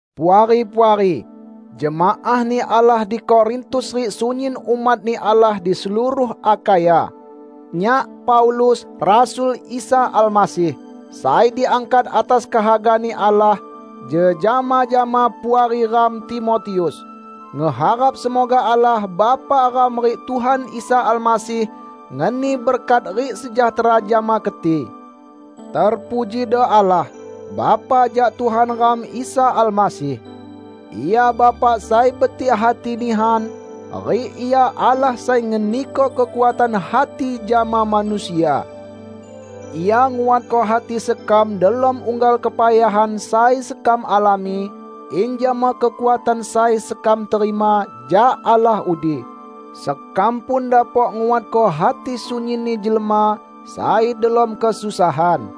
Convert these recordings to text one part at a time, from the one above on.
Puari-puari! Jemaah-Ni Allah di Korintus rik sunyin umat-Ni Allah di seluruh Akhaya. Nyak, Paulus, rasul Isa Almasih, sai diangkat atas kehaga-Ni Allah, jejama jama Puari ram Timotius, ngeharap semoga Allah Bapa ram rik Tuhan Isa Almasih ngeni berkat rik sejahtera jama keti. Terpujido Allah, Bapa jak Tuhan ram Isa Almasih. Ia Bapa sai betik hati nihan, rik Ia Allah sai ngeniko kekuatan hati jama manusia. Ia nguatko hati sekam delom unggal kepayahan sai sekam alami, in jama kekuatan sai sekam terima jak Allah udi, sekam pun dapok nguatko hati sunyinni jelma sai delom kesusahan.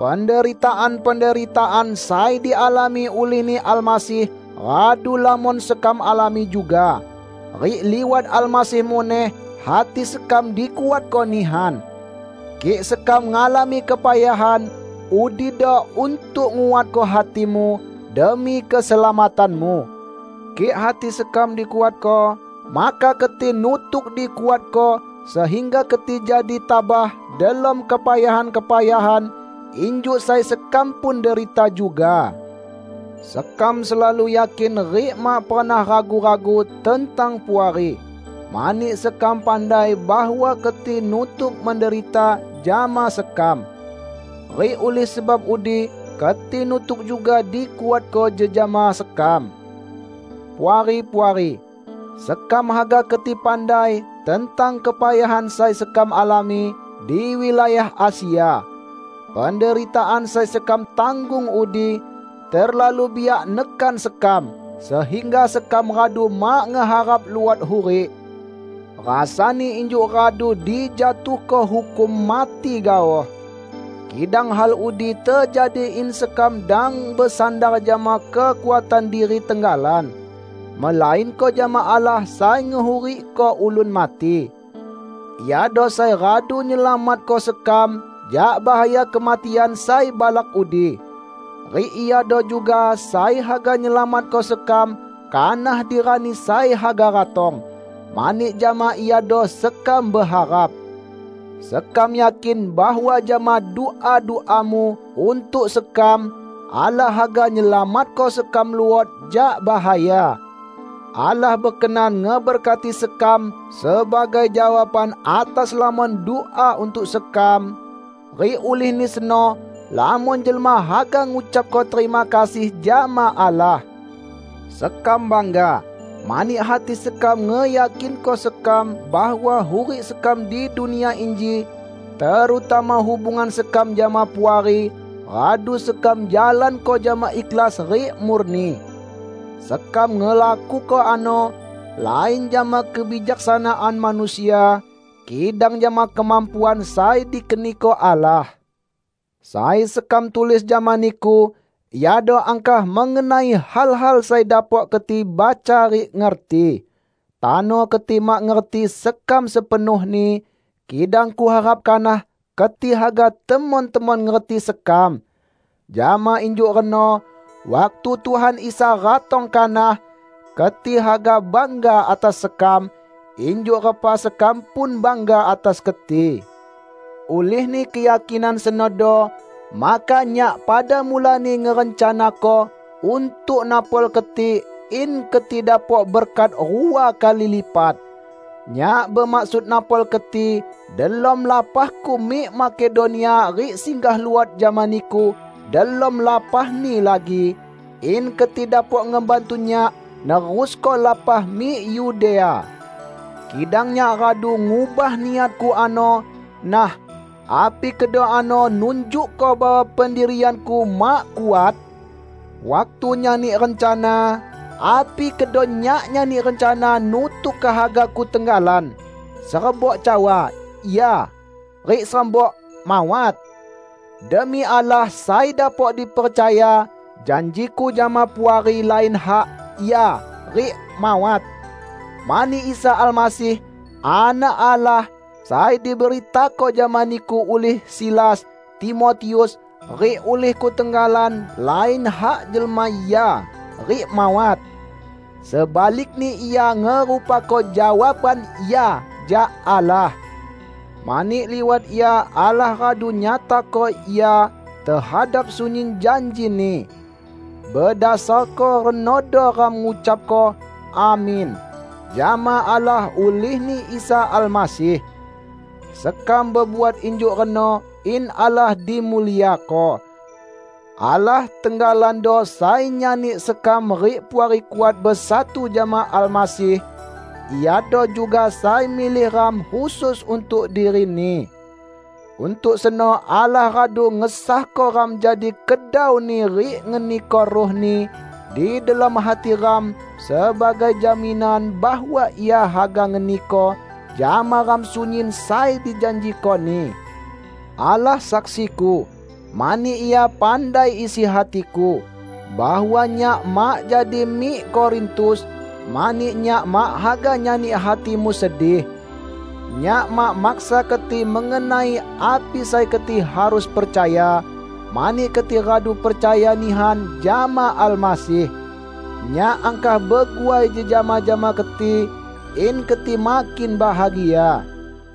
Penderitaan-penderitaan sai dialami ulih-Ni Almasih radu lamon sekam alami juga. Rik liwat Almasih muneh, hati sekam dikuatko nihan. Kik sekam ngalami kepayahan, udido untuk nguatko hatimu, demi keselamatanmu. Kik hati sekam dikuatko, maka keti nutuk dikuatko, sehingga keti jadi tabah delom kepayahan-kepayahan injuk sai sekam pun derita juga. Sekam selalu yakin rik mak pernah ragu-ragu tentang Puari, mani sekam pandai bahwa keti nutuk menderita jama sekam. Rik ulih sebab udi keti nutuk juga dikuatko jejama sekam. Puari-puari! Sekam haga keti pandai tentang kepayahan sai sekam alami di wilayah Asia. Penderitaan sai sekam tanggung udi terlalu biak nekan sekam sehingga sekam radu mak ngeharap luot hurik; rasani injuk radu dijatuhko hukum mati gaoh. Kidang hal udi tejadi in sekam dang besandar jama kekuatan diri tenggalan, melainko jama Allah sai ngehurikko ulun mati. Iado sai radu nyelamatko sekam jak bahaya kematian sai balak udi. Rik Iado juga sai haga nyelamatko sekam kanah di rani sai haga ratong, mani jama Iado sekam beharap. Sekam yakin bahwa jama dua-duamu untuk sekam, Allah haga nyelamatko sekam luot jak bahaya. Allah bekenan ngeberkati sekam sebagai jawaban atas lamon dua untuk sekam, rik ulihni seno lamon jelma haga ngucapko terima kasih jama Allah. Sekam bangga, mani hati sekam ngeyakinko sekam bahwa hurik sekam di dunia inji -- terutama hubungan sekam jama Puari -- radu sekam jalanko jama ikhlas rik murni. Sekam ngelakuko ano, lain jama kebijaksanaan manusia, kidang jama kemampuan sai dikeniko Allah. Sai sekam tulis jama niku iado angkah mengenai hal-hal sai dapok keti baca rik ngerti. Tano keti mak ngerti sekam sepenuhni, kidang kuharap kanah keti haga temon-temon ngerti sekam. Jama injuk reno, waktu Tuhan Isa ratong kanak, keti haga bangga atas sekam, injuk repa sekam pun bangga atas keti. Ulihni keyakinan senodo maka nyak pada mulani ngerencanako untuk napol keti in keti dapok berkat rua kali lipat. Nyak bemaksud napol keti delom lapahku mik Makedonia rik singgah luot jama niku delom lapahni lagi, in keti dapok ngebantu nyak nerusko lapah mik Yudea. Kidang nyak radu ngubah niatku ano; nah, api kedo ano nunjukko bahwa pendirianku mak kuat? Waktu nyani rencana, api kedo nyak nyani rencana nutuk kehagaku tenggalan, serebok cawa, "Ya", rik serebok "Mawat"? Demi Allah sai dapok dipercaya, janjiku jama Puari lain hak "Ya" rik "Mawat". Mani Isa Almasih, Anak Allah, sai diberitako jama niku ulih Silas, Timotius, rik ulihku tenggalan lain hak jelma "Ya" rik "Mawat". Sebalikni Ia ngerupako jawaban "Ya" jak Allah. Mani liwat Ia Allah radu nyatako "Ya" tehadap sunyin janji-Ni. Bedasarko renodo ram ngucapko "Amin" jama Allah ulihni Isa Almasih. Sekam bebuat injuk reno in Allah dimuliako. Allah tenggalando sai nyani sekam rik Puari kuat besatu jama Almasih; Iado juga sai milih ram khusus untuk diri-Ni. Untuk seno Allah radu ngesahko ram jadi kedau-Ni rik ngeniko Ruh-Ni di delom hati ram sebagai jaminan bahwa Ia haga ngeniko jama ram sunyin sai dijanjiko-Ni. Allah saksiku -- mani Ia pandai isi hatiku -- bahwa nyak mak jadi mik Korintus, mani nyak mak haga nyani hatimu sedih. Nyak mak maksa keti mengenai api sai keti harus percaya, mani keti radu percaya nihan jama Almasih. Nyak angkah beguai jejama jama keti in keti makin bahagia.